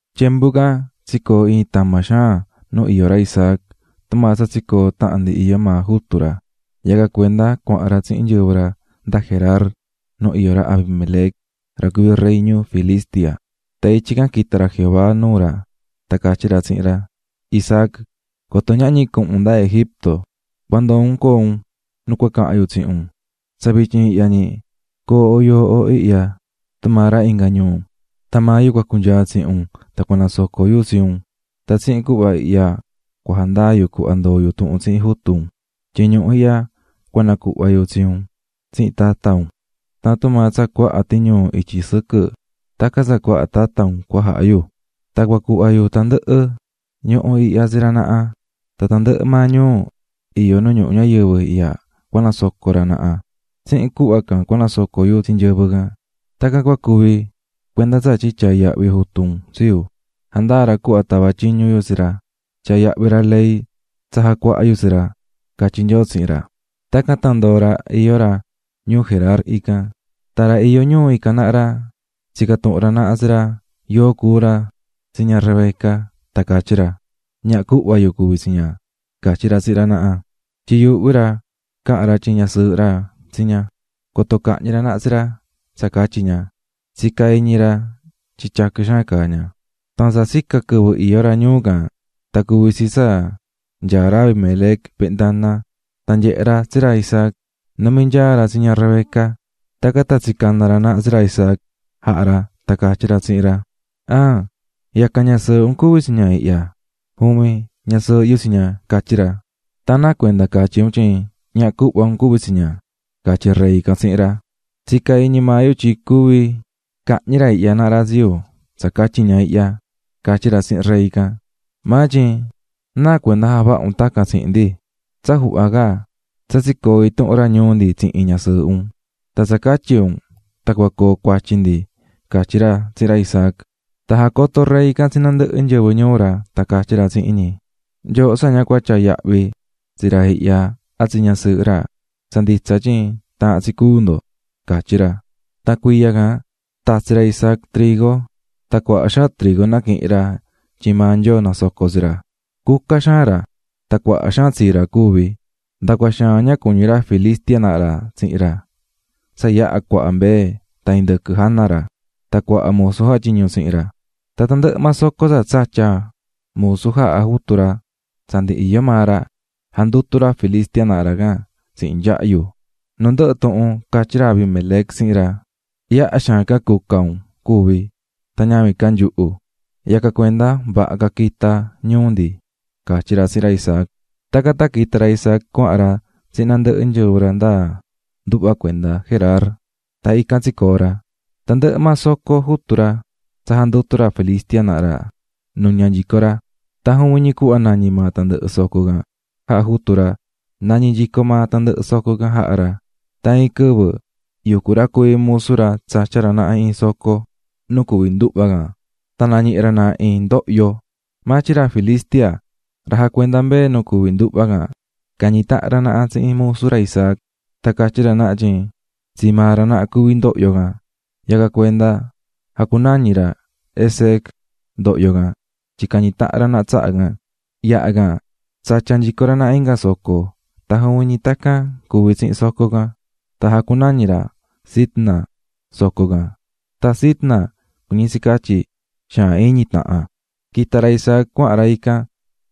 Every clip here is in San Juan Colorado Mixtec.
Tyembu can, tsicoo̱ iin tama xaan nu iyó ra Isaac tumaa tsa tsicoo̱ tahan ndi iyó maa jutu ra, yacan cuenda cuahan ra tsihin nyɨvɨ ra nda Gerar nu iyó ra Abimelec ra cuví rey ñuu Filistia. Tan ityi can quita̱ ra Jehová nuu ra tan catyí ra tsihin ra: "Isaac, coto ñahñi cuhun un nda Egipto, cua ndoo un coo un nu cua cahan yu tsihin un. Tsa vityin ihya ñi, co̱o yooho ihya, tumaa ra inga ñuu, tan maa yu cunyaa tsihin un tan cua nasoco yu tsi un, tan tsihin cuhva ihya cua jandaa yu cuhva ndoo̱ yu tuhun tsihin jutu un, tyin ñuhu ihya cua nacuhva yu tsi un tan tsi tata un. Tan tumaa tsa cuaha tiñuu ityi sɨquɨ tacan tsa cuaha tata un cua jaha yu, tan cua cuhva yu tandɨhɨ ñuhu ihya tsi ra naha, tan tandɨhɨ maa ñuu iyó nu ñuhu ñayɨvɨ ihya cua nasoco ra naha, tsihin cuhva can cua nasoco yu tsi nyɨvɨ can. Tacan cua cuvi cuenda tsatyin tyaa̱ yahvi jutu un tsi yu, jandaa̱ ra cuhva tava̱ tyiñu yu tsi ra, tyaa̱ yahvi ra ley tsa jacuaha̱ yu tsi ra", catyí Nyoo tsihin ra. Tacan tan ndoo̱ ra iyó ra ñuu Gerar ican. Tan ra iyó ñuu ican naha ra tsica̱ tuhun ra naha tsi ra yóo cuú ra tsi ña Rebeca, tan catyí ra: --Ñaha cuhva yu cuví tsi ña -catyí ra tsihin ra naha, tyin yuuhví ra coto cahñi ra naha tsi ra tsa catyi ña, tun cahan ra tyin ñasɨɨhɨ ra tsi ña tyin tyaquɨ xaan caá ña. Tan tsa tsica̱ quɨvɨ iyó ra ñuu can tan cuvi̱ tsi tsa nyaá ra Abimelec ventana tan nyehe̱ ra tsi ra Isaac numí nyaa ra tsi ña Rebeca. Tacan tan tsicana̱ ra naha tsi ra Isaac jaha̱ ra tan catyí ra tsihin ra: --¿An yacan ñasɨɨhɨ un cuví tsi ña ihya? --Juvin, ñasɨɨhɨ yu tsi ña --catyí ra. --Tan ¿náa cuenda catyí un tyin ñaha cuhva un cuví tsi ña? --catyí rey can tsihin ra. --Tsica̱ iñi maa yu tyin cuvi cahñi ra ihya naha ra tsi yu tsa catyi ña ihya --catyí ra tsihin rey can. --Maa tyin ¿náa cuenda javaha̱ un tacan tsihin ndi? Tsa juhva ca, tsa tsicoo̱ intuhun ra ñuu ndi tsihin ñasɨɨhɨ un. Tan tsa catyi un tan cua coo cuatyi ndi --catyí ra tsihin ra Isaac. Tan jacoto̱ rey can tsi nandɨhɨ nyɨvɨ ñuu ra, tan catyí ra tsihin ñi: --Nyooho tsa ña cua tyaa yahvi tsi ra ihya a tsi ñasɨɨhɨ ra, tsa nditsa tyin taahán tsi cúu ndo --catyí ra. Tan cuiya can tatsi̱ ra Isaac trigo. Tan cuaha xaan trigo naquihi̱n ra tyin maa Nyoo nasoco̱ tsi ra. Cuca xaan ra, tan cuaha xaan tsa tsii ra cuvi̱. Nda cua xaan ña cuñí ra Filistia naha ra tsihin ra tsa yaha cuaha mbee tan indɨquɨ jana ra, tan cuaha musu jatyiñú tsihin ra. Tan tandɨhɨ maa soco tsa tsatya̱ musu jaha̱ jutu ra tsa ndi iyó maa ra, jandutu̱ ra Filistia naha ra can tsihin nyahyu. Nu ndɨhɨ tuhun catyí ra Abimelec tsihin ra: --Yaha xaan ca cuca un cuvi̱ tan ñavin ca nyuhu. Yacan cuenda vaha ca quita un ñuu ndi --catyí ra tsihin ra Isaac. Tacan tan quita̱ ra Isaac cuahan ra tsihin nandɨhɨ nyɨvɨ ra nda nduhva cuenda Gerar, tan ican tsicoo̱ ra. Tandɨhɨ maa soco jutu ra tsa jandutu̱ ra Filistia naha ra, nuña̱ nyico ra, tan juvin ñi cuhva nañí maa tandɨhɨ soco can jaha̱ jutu ra, nañí nyico maa tandɨhɨ soco can jaha̱ ra. Tan iin quɨvɨ yucú ra cuví musu ra tsatyá ra naha iin soco nu cuví nduhva can, tan nañihi̱ ra naha iin ndohyo. Maa tyin ra Filistia ra jacuendá mbee nu cuví nduhva can cañi̱ tahan ra naha tsihin musu ra Isaac tan catyí ra naha tyin tsii maa ra naha cuví ndohyo can. Yacan cuenda jacunañi̱ ra "Esek" ndohyo can tyin cañi̱ tahan ra naha tsaha can. Yaha can tsatya̱ nyico ra naha inga soco tan juvin ñi tacan cuvi̱ tsihin soco can, tan jacunañi̱ ra "Sitna" soco can. Tan Sitna cuñí tsi catyi: xaan iñi tahan. Quita̱ ra Isaac cuahan ra ican,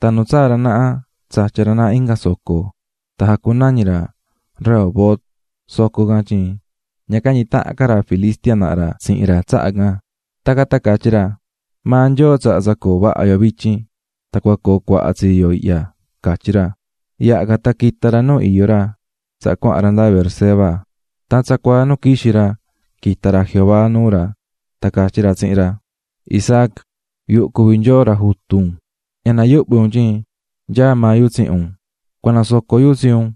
tan nu tsaa̱ ra naha tsatya̱ ra naha inga soco, tan jacunañi̱ ra Rehobot soco can tyin ña cañi̱ tahan ca ra Filistia naha ra tsihin ra tsaha can, tacan tan catyí ra: "Maa Nyoo tsaha̱ tsa coo vaha yo vityin, tan cua coo cuaha tsii yo ihya", catyí ra. Yaha can tan quita̱ ra nu iyó ra tsaha cuahan ra nda Beerseba. Tan tsacuaa nu quixi̱ ra quita̱ ra Jehová nuu ra tan catyí ra tsihin ra: "Isaac, yuhu cuví Nyoo ra jutu un. Ña nayuhvi un tyin nyaá maa yu tsihin un. Cua nasoco yu tsi un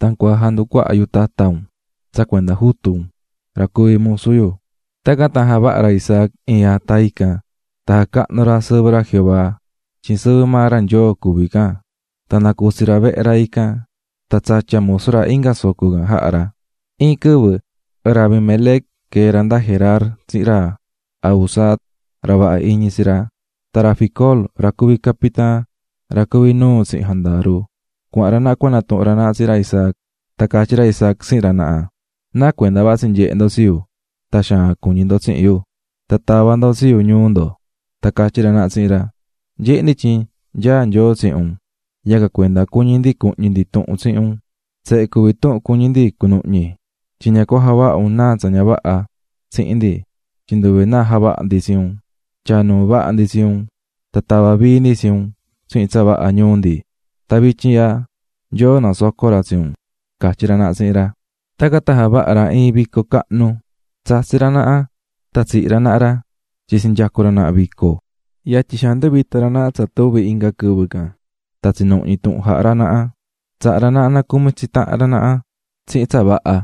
tan cua janducuaha yu tata un. tsa cuenda jutu un, ra cuvi̱ musu yu." Tacan tan javaha̱ ra Isaac iin ata ican, tan jacahnu̱ ra sɨvɨ ra Jehová, tyin sɨvɨ maa ra Nyoo cuví can, tan nacutsi̱ ra vehe ra ican, tan tsatya̱ musu ra inga soco can jaha̱ ra. Iin quɨvɨ ra Abimelec quee̱ ra nda Gerar tsihin ra Ahuzat, ra vaha iñi tsi ra, tan ra Ficol ra cuví capitaan ra cuví nuu tsihin jandaru, cuahan ra naha cua natuhun ra naha tsihin ra Isaac. Tan catyí ra Isaac tsihin ra naha: --¿Náa cuenda vatsí nyehe ndo tsi yu tan xaan iñi ndo tsi yu tava̱ ndo tsi yu ñuu ndo? Tan catyí ra naha tsihin ra: --Nyehé ndi tyin nyaá Nyoo tsihin un, yacan cuenda cuñí ndi cuhñi ndi tuhun tsihin un. Tsehe cuví tuhun cuñí ndi cunuhñi. Tyin ña cua javaha un náa tsa ña vaha tsihin ndi, tyin nduve náa javaha̱ ndi tsi un, tyaa̱ nuu vaha ndi tsi un tan tava̱ vii ndi tsi un tsihin tsa vaha ñuu ndi, tan vityin ihya Nyoo nasocó ra tsi un --catyí naha tsihin ra. Tacan tan javaha̱ ra iin vico cahnu, tsatsi̱ ra naha tan tsihi̱ ra naha ra tyin tsinyacu̱ ra naha vico. Yatyi xaan nduvita̱ ra naha tsa tuvi̱ inga quɨvɨ can tan tsinuhñi̱ tuhun jaha̱ ra naha. Tsaha̱ ra naha nacumi tsi tahan ra naha tsihin tsa vaha,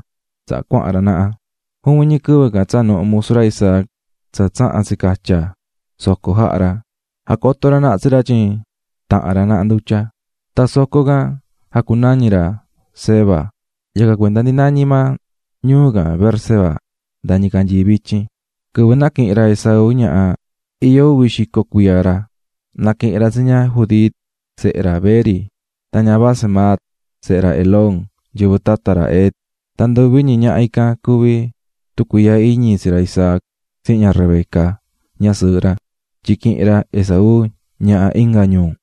tsaha cuahan ra naha. Juvin ñi quɨvɨ can tsaa̱ nuhu musu ra Isaac tsa tsaha̱n tsicatya̱ soco jaha̱ ra, jacoto̱ ra naha tsi ra tyin taha̱n ra naha ndutya. Tan soco can jacunañi̱ ra "Seba", yacan cuenda ndi nañí maa ñuu can Beerseba nda ñicanyii vityin. Quɨvɨ naquihi̱n ra Esaú ñaha, iyó uvi xico cuiya ra. Naquihi̱n ra tsi ña Judit, sehe ra Beeri, tan ña Basemat, sehe ra Elón, nyɨvɨ tata ra Het; tan nduvi ñi ñaha ican cuví tucuiihya iñi tsi ra Isaac tsihin ña Rebeca, ñasɨɨhɨ ra, tyin quihi̱n ra Esaú ñaha inga ñuu.